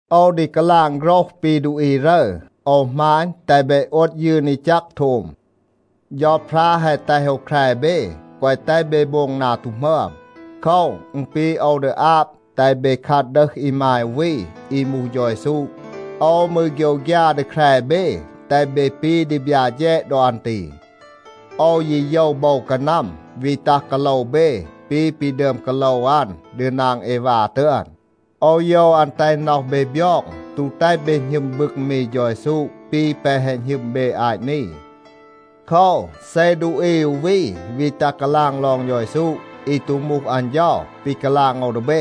โอว ดี กาลาง โฆรห ปี ดูอี รึร. โอว หมาณ, แตห เบ โอด ยืน อี แจก โทม. เฌาพรา แฮะ แตห โอว แคร เบ, แกวะ แตห เบ โบง นา ตู หมึอม. โคว, อึณ ปี โอว ดี อาบ แตห เบ คัด ดึห อีมาย อู วี อี มูห เฌา เยซู. โอว มืร โฆยวฆยา ดี แคร เบ, แตห เบ ปี ดีบยา แฌด ดอ อัน ตี. โอว ยี โยว โบว กานัม วี ตัห กาโลว เบ ปี ปี ดึอม กาโลว อัน ดี นาง เอวา ตึอน. โอว โยว อัน แตห น็อห เบ บยอง, ตู แตห เบ หณึม บึง มี เฌา เยซู ปี แปะ แฮะ หณึม เบ อาต นี. โคว, เซ ดูอี อู วี วี ตัห กาลาง ลอง เฌา เยซู อี ตู มูห อัน เฌา ปี กาลาง โอว ดี เบ,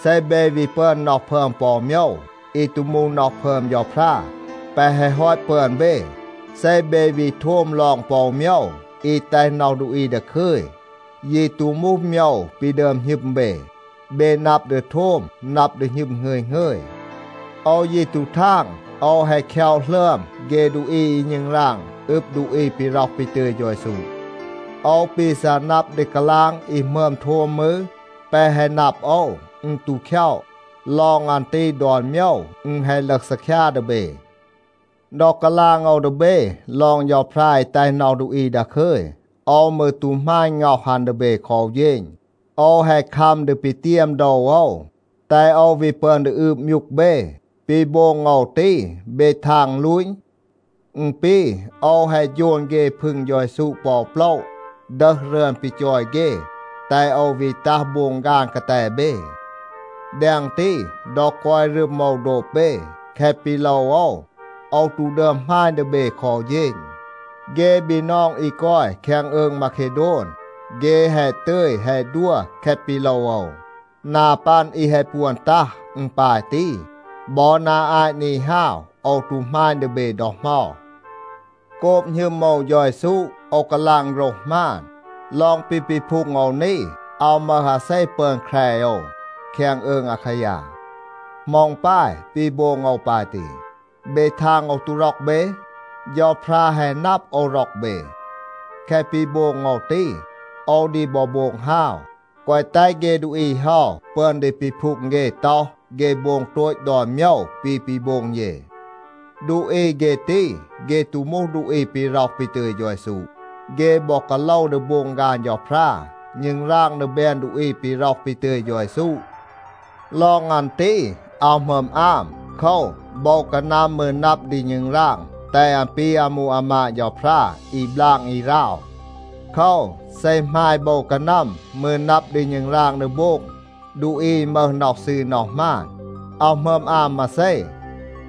เซ เบ วี ปึอน น็อห พึอม ปอ อู โมยว อี ตู มูห น็อห พึอม เฌาพรา แปะ แฮะ ฮอต ปึอน เบ, เซ เบ วี โทม ลอง ปอ อู โมยว อี แตห น็อห ดูอี ดาคึย, ยี ตู มูห โมยว ปี ดึอม หณึม เบ, เบ นับ ดี โทม, นับ ดี หณึม หงึย หงึย. โอว ยี ตู ทาง, โอว แฮะ คย็อะ หลึอม เฆ ดูอี อี ณึงราง อึบ ดูอี ปี ร็อห ปี ตึย เฌา เยซู. โอว ปี ซัะ นับ ดี กาลาง อี หมึอม โทม มืร, แปะ แฮะ นับ โอว, อึณ ตู คย็อะ. ลอง อัน ตี ดอน โมยว อึณ แฮะ ลึห ซีคยา ดี เบ. ดอ กาลาง โอว ดี เบ ลอง เฌาพรา อี แตห น็อห ดูอี ดาคึย, โอว มืร ตู หมาณ ง็อห อัน ดี เบ คอ อู เฌณ. โอว แฮะ คัม ดี ปีเตียม โดว โอว, แตห โอว วี ปึอน ดี อืบ มยูก เบ. ปี โบง โอว ตี, เบ ทาง อึณ ลูต? อึณ ปี, โอว แฮะ โฌน เฆ พึง เฌา เยซู ปอ โปละ, ดึห รึอน ปี จอย เฆ, แตห โอว วี ตัห โบง ฆาน กาแต เบ. แดง ตี, ดอ กอย รึม โอว โดบ เบ, แคะ ปี โลว โอว, โอว ตู ดึอม หมาณ ดี เบ คอ อู เฌณ. เฆ บีนอง อี กอย แคง อืง มาเคโดน, เฆ แฮะ ตึย แฮะ ดัว แคะ ปี โลว โอว. นา ปัน อี แฮะ ปวน ตัห, อึณ ปาย ตี. บอ นา อาต นี ฮาว โอว ตู หมาณ ดี เบ ดอ เหมา. โกบ หณึม โอว เฌา เยซู, โอว กาลาง โฆรห หมาน. ลอง ปี ปีพูง โอว นี, อาว มึห อาเซ ปึอน แคร โอว แคง อืง อาคายา. เหมา อึณ ปาย ปี โบง โอว ปาย ตี? เบ ทาง โอว ตู ร็อก เบ? เฌาพรา แฮะ นับ โอว ร็อก เบ. แคะ ปี โบง โอว ตี, โอว ดี บอ โบง ฮาว, แกวะ แตห เฆ ดูอี เฮา ปึอน ดี ปีพูง เฆ ต็อห, เฆ โบง โตต ดอน โมยว ปี ปี โบง เย. ดูอี เฆ ตี, เฆ ตู มูห ดูอี ปี ร็อห ปี ตึย เฌา เยซู. เฆ บอ กาโลว ดี โบง ฆาน เฌาพรา, ณึงราง ดี แบน ดูอี ปี ร็อห ปี ตึย เฌา เยซู. ลอง อัน ตี, อาว หมึอม อาม. โคว, โบว กานัม มืร นับ ดี ณึงราง แตห อัน ปี อามู อามาด เฌาพรา อี บลาง อี ราว. โคว, เซ หมาย โบว กานัม มืร นับ ดี ณึงราง ดี โบง ดูอี อี มึห น็อห ซืร น็อห หมาน, อาว หมึอม อาม มาเซ.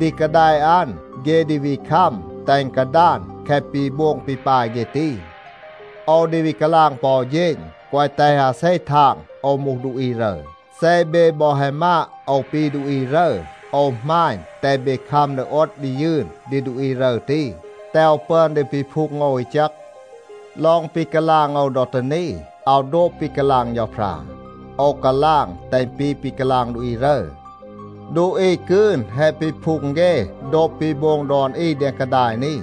ดี กาแดะ อัน, เฆ ดี วี คัม แตห อึณ กาดาน แคะ ปี โบง ปี ปาย เฆ ตี. โอว ดี วี กาลาง ปอ อู เฌณ, แกวะ แตห อาเซ ทาง โอว มูห ดูอี รึร. เซ เบ บอ แฮะ มาด โอว ปี ดูอี รึร, โอว หมาณ, แตห เบ คัม ดี โอด ดี ยืน ดี ดูอี รึร ตี, แตห โอว ปึอน ดี ปีพูง โอว อี แจก. ลอง ปี กาลาง โอว ดอ ตี นี, อาว โดบ ปี กาลาง เฌาพรา. โอว กาลาง แตห อึณ ปี ปี กาลาง ดูอี รึร. ดูอี กืน แฮะ ปีพูง เฆ โดบ ปี โบง ดอน อี แดง กาดาย นี.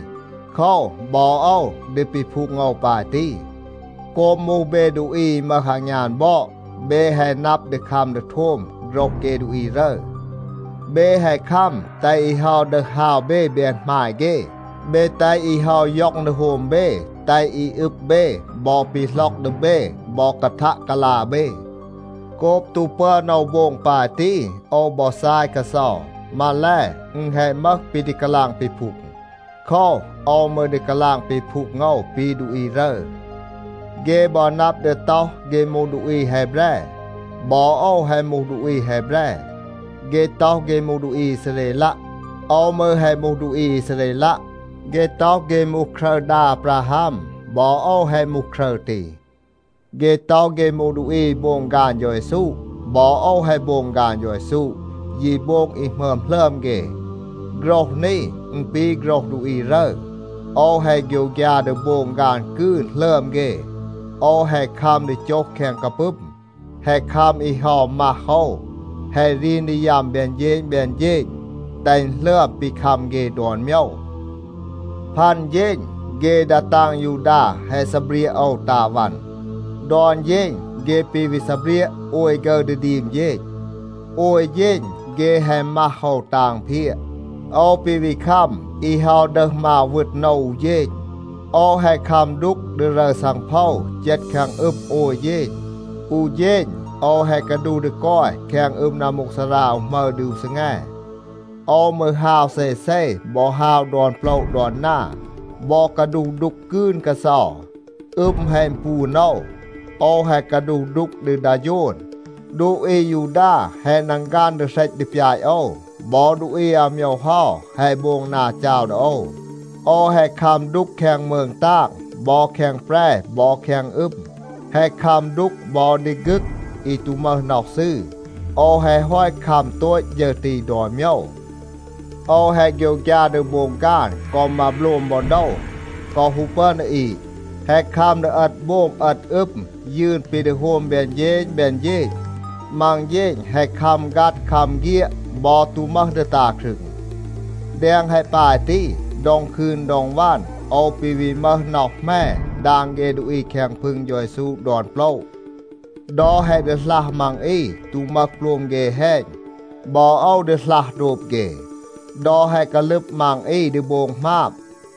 โคว, บอ โอว ดี ปีพูง โอว ปาย ตี. โกบ มูห เบ ดูอี อี มึห อางยาน บอด, เบ แฮะ นับ ดี คัม ดี โทม โฆรห เฆ ดูอี รึร. เบ แฮะ คัม แตห อี เฮา ดึห ฮาว เบ แบน หมาย เฆ. เบ แตห อี เฮา ย็อง ดี โฮม เบ, แตห อี อึบ เบ บอ ปีหล็อก ดี เบ บอ กาทัะ กาลา เบ. โกบ ตู ปึอน โอว โบง ปาย ตี, โอว บอ ซาย กาเซา. มาแล, อึณ แฮะ มึห ปี ดี กาลาง ปีพูง. โคว, โอว มืร ดี กาลาง ปีพูง โอว ปี ดูอี รึร. เฆ บอ นับ ดี ต็อห เฆ มูห ดูอี แฮแบร. บอ โอว แฮะ มูห ดูอี แฮแบร. เฆ ต็อห เฆ มูห ดูอี อีซาเรลัะ. โอว มืร แฮะ มูห ดูอี อีซาเรลัะ. เฆ ต็อห เฆ มูห ครึร ดา อาบราฮัม. บอ โอว แฮะ มูห ครึร ตี. เฆ ต็อห เฆ มูห ดูอี อี โบง ฆาน เฌา เยซู. บอ โอว แฮะ โบง ฆาน เฌา เยซู, ยี โบง อี หมึอม หลึอม เฆ. (โฆรห นี อึณ ปี โฆรห ดูอี รึร.) โอว แฮะ โฆยวฆยา ดี โบง ฆาน กืน หลึอม เฆ. โอว แฮะ คัม ดี โจห แคง กาปึม, แฮะ คัม อี เฮา มัห โอว, แฮะ รีน ดี ยัม แบน เฌณ แบน เฌณ, แตห อึณ หลึอม ปี คัม เฆ ดอน โมยว. พัน เฌณ เฆ ดา ตาง ยูดา แฮะ ซีเบรียะ โอว ตา วัน. ดอน เฌณ เฆ ปี วี ซีเบรียะ โอย ฆึร ดี ดีม เฌณ. โอย เฌณ เฆ แฮะ มัห โอว ตา อึณเพียะ. โอว ปี วี คัม อี เฮา ดึห มาว วึณ โอว อู เฌณ. โอว แฮะ คัม ดูก ดี รึร ซังโพว เจต แคง อึม โอย เฌณ. อู เฌณ โอว แฮะ กาดูห ดี กอย แคง อึม นัมมูกซารา อู หมึร ดี อู ซีแง. โอว มืร ฮาว เซเซ บอ ฮาว ดอน โปละ ดอน นา บอ กาดูห ดูก กืน กาเซา. อึม แฮะ อึณปูน โอว. โอว แฮะ กาดูห ดูก ดี ดา โฌน. ดูอี อายูดา แฮะ นังฆัน ดี เหรต ดี ปยาต โอว. บอ ดูอี อาโมยว เฮา แฮะ โบง นา จาว ดี โอว. โอว แฮะ คัม ดูก แคง มืง ตาง บอ แคง แปร บอ แคง อึม, แฮะ คัม ดูก บอ ดี ฆึก อี ตู มึห น็อห ซืร. โอว แฮะ ฮอต คัม โตต ฌึร ตี ดอน โมยว. โอว แฮะ โฆยวฆยา ดี โบง ฆาน กอ มาโบลม บอ โดว, กอ ฮู ปึอน ดี อีด. แฮะ คัม ดี เอต โบม เอต อึม, ยืน ปี ดี โฮม แบน เฌณ แบน เฌณ. มัง เฌณ แฮะ คัม ฆัด, คัม เฆียด บอ ตู มึห ดี ตา ครึง. แดง แฮะ ปาย ตี, ดอง คืน ดอง วัน โอว ปี วี มึห น็อห แหม ดาง เฆ ดูอี แคง พึง เฌา เยซู ดอน โปละ. ดอ แฮะ ดีหลัห มัง อี ตู มึห โปลม เฆ แฮณ, บอ โอว ดีหลัห โดบ เฆ. ดอ แฮะ กาลึบ มัง อี ดี โบง หมาบ,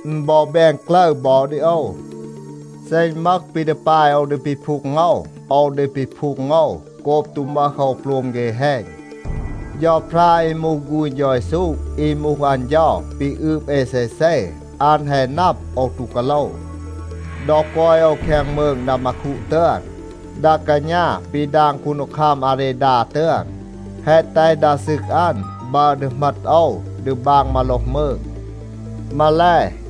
อึณ บอ แบน กลึร บอ ดี โอว. เซ อึณ มึห ปี ดี ปาย โอว ดี ปีพูง โอว, โอว ดี ปีพูง โอว โกบ ตู มึห โอว โปลม เฆ แฮณ. เฌาพรา อี มูห ฆูณ เฌา เยซู อี มูห อัน เฌา ปี อืบ เอ เซเซ, อัน แฮะ นับ, โอว ตู กาโลว. ดอ กอย โอว แคง มืง ดามาคู ตึอน, ดา กาณา ปี ดาง คูนดีคัม อาเรดา ตึอน, แฮะ แตห ดา ซึก อัน บัร ดี เหมต โอว ดี บาง มาโลห มืง. มาแล,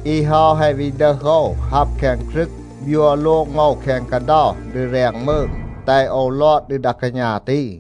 อี เฮา แฮะ วี ดึห โอว ฮับ แคง กรึก, บยัว โลง โอว แคง กาเดา ดี แรง มืง, แตห โอว ลอด ดี ดา กาณา ตี.